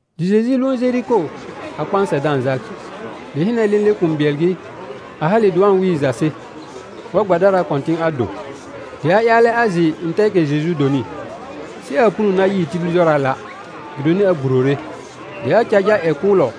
Dɩ Jeju lʋʋn Jeriko a kpãsɛ da-n jal. Dɩ hɩnɛ, lẽle kũu bɩɛl gɩ, a hale dɩ wa-n wɩɩ Jase, war gbadaraa kɔ̃tɩ̃ a do. Dɩ a ƴaalɛ a jɩ ntɛɛkɛ Jeju donɩ, sɩ aa puno na yɩɩ tibil jɔraala', gɩdonɩ a gburore. Dɩ a car jal ƴɛ kʋʋlɔ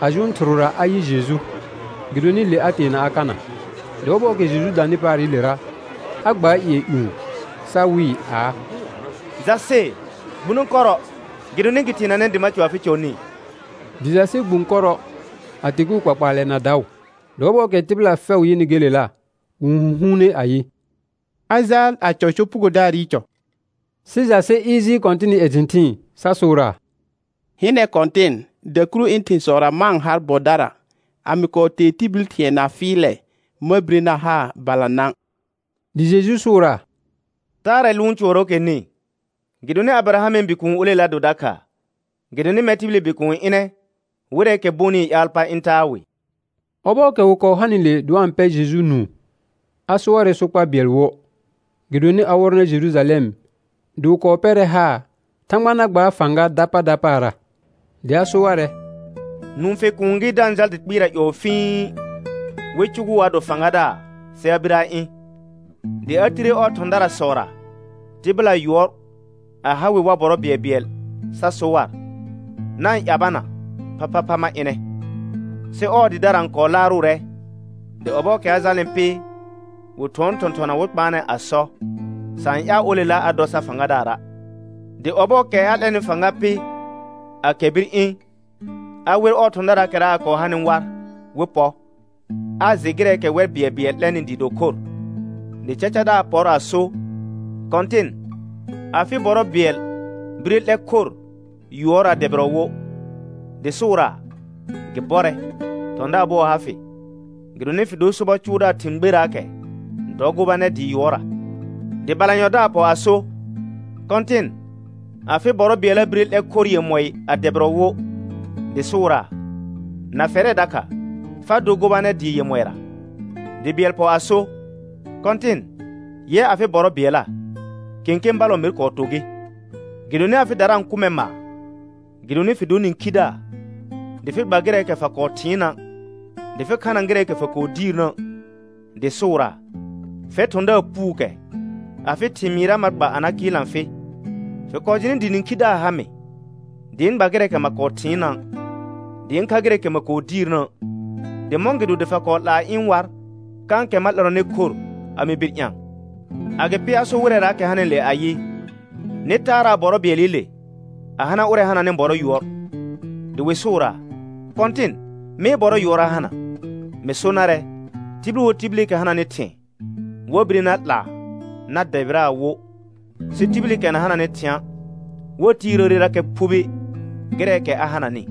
a jʋʋn thɩrʋra a yɩ Jeju, gɩdonɩ le a teena a kana. Dɩ ɔbɔɔkɛ Jeju danɩ paarɩlera, a gbaar hɩɩn ƴũ sa wɩɩ aa: Jase, gbuno kɔrɔ, gɩdonɩ gɩ teenanɛ dɩ ma cɔ afɩ cɔ nĩ. Dɩ Jase gbũ kɔrɔ a teguu kpakpaalɛ na daʋ. Dɩ ɔbɔɔkɛ tɩbɩla fɛʋ yɩnɩ gelela, wɩ-n hũhuune ayɩ: A jaal a cɔ sopugodaarɩ cɔ. Sɩ Jase ɩɩr jɩɩl Kɔ̃tɩnɩ ƴɛ thɩ̃thɩɩn sa sʋʋraa: Hɩnɛ Kɔ̃tɩn, dakuru ɩ̃ thɩ̃sɔra ma-n har bɔdara. A mɩ kɔɔ tee tibil thɩ̃ɛ na fɩɩlɛ, ma bire na haa balanã. Dɩ Jeju sʋʋraa: Taarɛ lʋʋn cʋɔrɔɔkɛ nĩ, gɩdonɩ Abɩrahamɩ bikuun olela do dakha. Gɩdonɩ mɛr tibili Bikuun ɩnɛ wɩrɛɛkɛ bonɩɩ ƴaal pa ɩ̃ taa wɩ. Ɔbɔɔkɛ wɩ kɔɔ hanɩle dɩ wa-n pɛ Jeju nũu, a so warɛ sokpa bɩɛl wo, gɩdonɩ a wɔrɔnɛ Jerujalɛm dɩ wɩ kɔɔ pɛrɛ haar Thãgba na gbaar fãga dapa dapaara. Dɩ a so warɛ: Nũfe kuun gɩ da-n jal dɩ kpɩɩra ƴɔɔ fh wɩ cʋgʋʋ a do fãgadaar, sɩ a bir a ɩ̃. Dɩ a tire ɔɔ thɔ̃darasɔra tɩbɩla yʋɔr a ha wɩ war bɔrɔ bɩɛlbɩɛl sa so war: Na-n ƴabana phaphapha ma ɩnɛ. Sɩ ɔɔ dɩdara n kɔɔ laarʋʋrɛ, dɩ ɔbɔɔkɛ a jalnɩ pɩ, wɩ thʋɔn thɔ̃thɔna wɩ kpaanɛ a sɔ: Sa-n ƴaal olela a dɔ sar fãgadaara'. Dɩ ɔbɔɔkɛ a 'lɛnɩ fãga pɩ, a kɛr bir ɩ̃. A wer thɔ̃daraakɛra a kɔɔ hanɩ war wɩ pɔ, a jɩ gɩrɛɛkɛ wɛr bɩɛlbɩɛl 'lɛnɩ dɩɩ do khor. Dɩ cacadaar pɔr a sor: Kɔ̃tɩn, afɩ bɔrɔ bɩɛl bire 'lɛr khor yʋɔɩ a dɛbɩrɔ wo. Dɩ sʋʋraa: Gɩ bɔrɛ, thɔ̃daar bʋɔ ha fɩ. Gɩdonɩ fɩ dor sobɔ cʋʋdaar thɩ̃ gberakɛ, dɔ gobanɛr dɩɩ yʋɔrra. Dɩ balanyɔdaar pɔ a so: Kɔ̃tɩn, afɩ bɔrɔ bɩɛlla bire 'lɛr khor yemɔɩ a dɛbɩrɔ wo. Dɩ sʋʋraa: Na fɛrɛ dakha, fa dor gobanɛr dɩɩ yemɔɩra. Dɩ bɩɛl pɔ a so: Kɔ̃tɩn, yɛ afɩ bɔrɔ bɩɛlla kẽkẽ ballɔ mer kɔɔ to gɩ. Gɩdonɩ afɩdara n kʋ mɛr maar gɩdonɩ fɩ dor nĩkhidaar, dɩ fɩ gba gɩrɛɛkɛ fa kɔɔ thɩɩnna', dɩ fɩ khana gɩrɛɛkɛ fa kɔɔ diirnə'. Dɩ sʋʋraa: Fɛr thɔ̃daar puukɛ, afɩ thɩmɩɩra ma gba a na kɩɩlna fɩ. Fɩ kɔɔ jɩnɩ dɩ nĩkhidaar ha mɩ, dɩ ɩ̃ gba gɩrɛɛkɛ ma kɔɔ thɩɩnna', dɩ ɩ̃ kha gɩrɛɛkɛ ma kɔɔ diirnə'. Dɩ mɔ̃gɩdo dɩ fa kɔɔ 'laa ɩ̃ war kãkɛ ma 'lɛrɔnɩ khor a mɩ bir ɩ̃a? Agɩpɩ a sor wɩrɛraakɛ hanɩle ayɩ: Nɩ taaraa bɔrɔ bɩɛlɩle, a hana ʋrɛ hananɩ bɔrɔ yʋɔr. Dɩ wɩ sʋʋraa: Kɔ̃tɩn, mee bɔrɔ yʋɔr a hana. Mɩ so narɛ, tibil wo tibilikɛ hananɩ thɩ̃ɛ, wa bire na 'laa na dɛbɩraa wo, sɩ tibilikɛ na hananɩ thɩ̃a', wa tiirəərerakɛ phubi gɩrɛɛkɛ a hananɩ.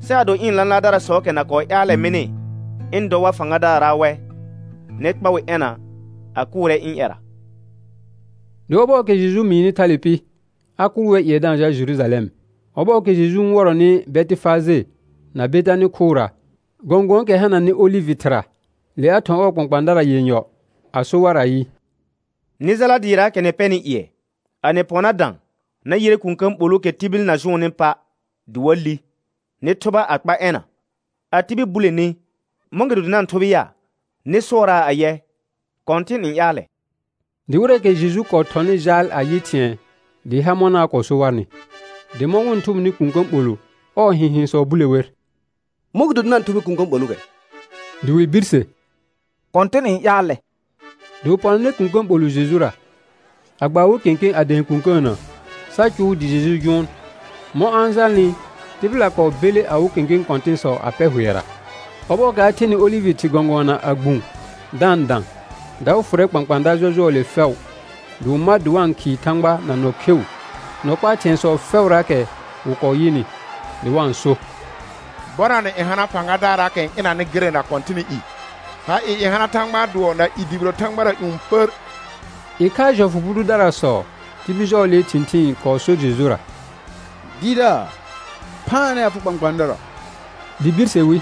Sɩ ado ɩ̃ lãlaardarasɔɔkɛ na kɔɔ ƴaalɛ mɩnɩ ɩ̃ dɔ war fãgadaara' wɛ, nɩ kpa wɩ ɛna a kʋʋrɛ ɩ̃ ƴɛra. Dɩ ɔbɔɔkɛ Jeju mɩɩnɩ thale pɩ, a kʋʋl wɛr ƴɩɛ da-n jal Jerujalɛm. Ɔbɔɔkɛ Jeju n wɔrɔnɩ Bɛtɩfaje na Betanɩ khʋra, gɔ̃gʋ̃ɔɔkɛ hananɩ olɩvɩ thɩra, le a thɔ̃ ɔɔ kpãkpãadara yenyɔ a so war ayɩ: Nɩ jala dɩɩraakɛ nɩ pɛnɩ ƴɩɛ. A nɩ pɔ na dã, na yɩrɛ kũkə̃ ɓolʋʋkɛ tibil na jʋʋnnɩ pa' dɩ wa li. Nɩ thʋba a kpa ɛna. A tibil bule ni: Mɔ̃gɩdo dɩ na-n thʋbɩ ya? Nɩ sʋɔraa ayɛ: Kɔ̃tɩn n ƴaalɛ. Dɩ wɩrɛɛkɛ Jeju kɔɔ thɔnɩ jaal a yɩ thɩ̃ɛ dɩɩ ha mɔna a kɔɔ so warnɩ. Dɩ mɔ̃ wɩ-n thʋbɩnɩ kũkə̃ ɓolʋ, ɔɔ hɩ̃hɩ̃sɔ bule wer. Mɔ̃gɩdo dɩ na-n thʋbɩ kũkə̃ ɓolʋʋkɛ? Dɩ wɩ birse: Kɔ̃tɩn n ƴaalɛ. Dɩ wɩ pɔnanɛ kũkə̃ ɓolʋ Jejura, a gba awɩ kẽkẽ a dɛ̃ɛ kũkəənə, sa cʋʋ dɩ Jeju jʋʋn. Mɔ̃ a-n jalnɩ, tɩbɩla kɔɔ belle awɩ kẽkẽ kɔ̃tɩ̃sɔ a pɛr hʋɛra. Ɔbɔɔkɛ a thenɩ olɩvɩ thɩr gɔ̃gʋɔna a gbũ da-n dã, daʋ fʋrɛ kpãkpãada jɔjʋɔɔle fɛʋ, dɩ wɩ ma dɩ wa-n khɩɩ Thãgba na nɔ kheu nɔ kpaa thɩ̃ɛsɔ fɛʋraakɛ wɩ kɔɔ yɩnɩ. Dɩ wa-n so: «Bɔnanɛ n hana fãgadaarraakɛ n ɩnanɩ gɩrɛ na Kɔ̃tɩnɩ i. Ha ɩɩ n hana Thãgbaa dʋɔ na i dʋbɩrɛ thãgbara ƴũ pər.» Ɩkhaa jɔfʋ bʋ dʋdarasɔ tibil jɔɔlee thɩ̃thɩɩn kɔɔ sor Jejura: Dɩɩrdaar, phaanɛ afɩ kpãkpãadara. Dɩ birse wi: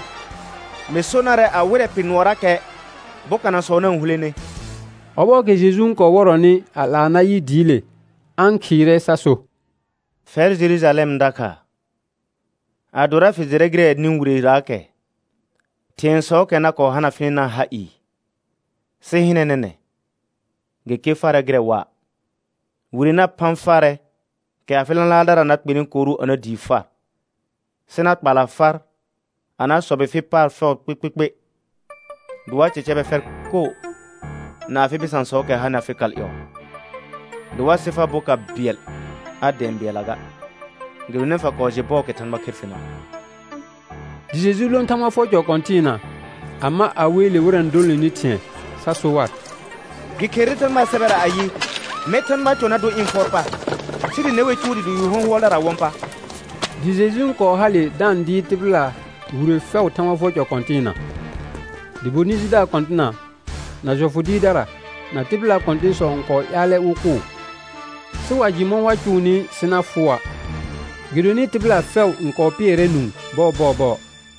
Mɩ so narɛ a wɩrɛ pɩr nʋɔrakɛ, bokanasɔ na-n hulene. Ɔbɔɔkɛ Jeju n kɔɔ wɔrɔnɩ a 'laa na yɩ dɩɩle, a-n khɩɩrɛ sa so: Fɛrɛ Jerujalɛm dakha, adora fɩ jɩrɛ gɩrɛ nĩ wireraakɛ thɩ̃ɛsɔɔkɛ na hana fɩnɩna ha ɩɩ, sɩ hɩnɛ nɛnɛ̃, gɩ ker farɛ gɩrɛ waa. Wire na phã farɛ kɛ afɩ lãlaardara na kpenɩ koru a na dii far, sɩ na kpala far a na sɔbɩ fɩ paar fɛʋ kpɩkpɩkpɩ. Dɩ wa cɛcɛbɛ fɛr koo na afɩ bɩsãsɔɔkɛ hanɩ afɩ kal ƴɔɔ, dɩ wa sɩ far boka bɩɛl a dɛ̃ɛ bɩɛlla ga, gɩdonɩ fa kɔɔ jɩ bɔɔkɛ Thãgba kher fɩna'. Dɩ Jeju lõ Thãgba fʋɔr cɔ kɔ̃tɩɩna, a ma a weele wɩrɛ n dolonenɩ thɩ̃ɛ, sa so war: Gɩ kherere Thãgbaa sɛbɛra ayɩ: «Mɛr Thãgbaa cɔ na dor ɩ̃ fʋɔr pa», sɩ dɩ ne wer cʋʋ dɩɩ do yu hɔ̃hʋɔldaraa wɔ̃ pa. Dɩ Jeju n kɔɔ hale da-n dɩɩr tɩbɩla wire fɛʋ Thãgba fʋɔr cɔ kɔ̃tɩɩna. Dɩ bonɩ jidaar kɔ̃tɩna na jɔfʋ dɩɩrdara na tɩbɩlaa kɔ̃tɩ̃sɔ n kɔɔ ƴaalɛ wɩ kʋʋ. Sɩ wa jɩ mɔ̃ wa cʋʋnɩ sɩ na fʋʋa', gɩdonɩ tɩbɩla fɛʋ n kɔɔ pɩɛrɛ nũu bɔɔbɔɔbɔɔ.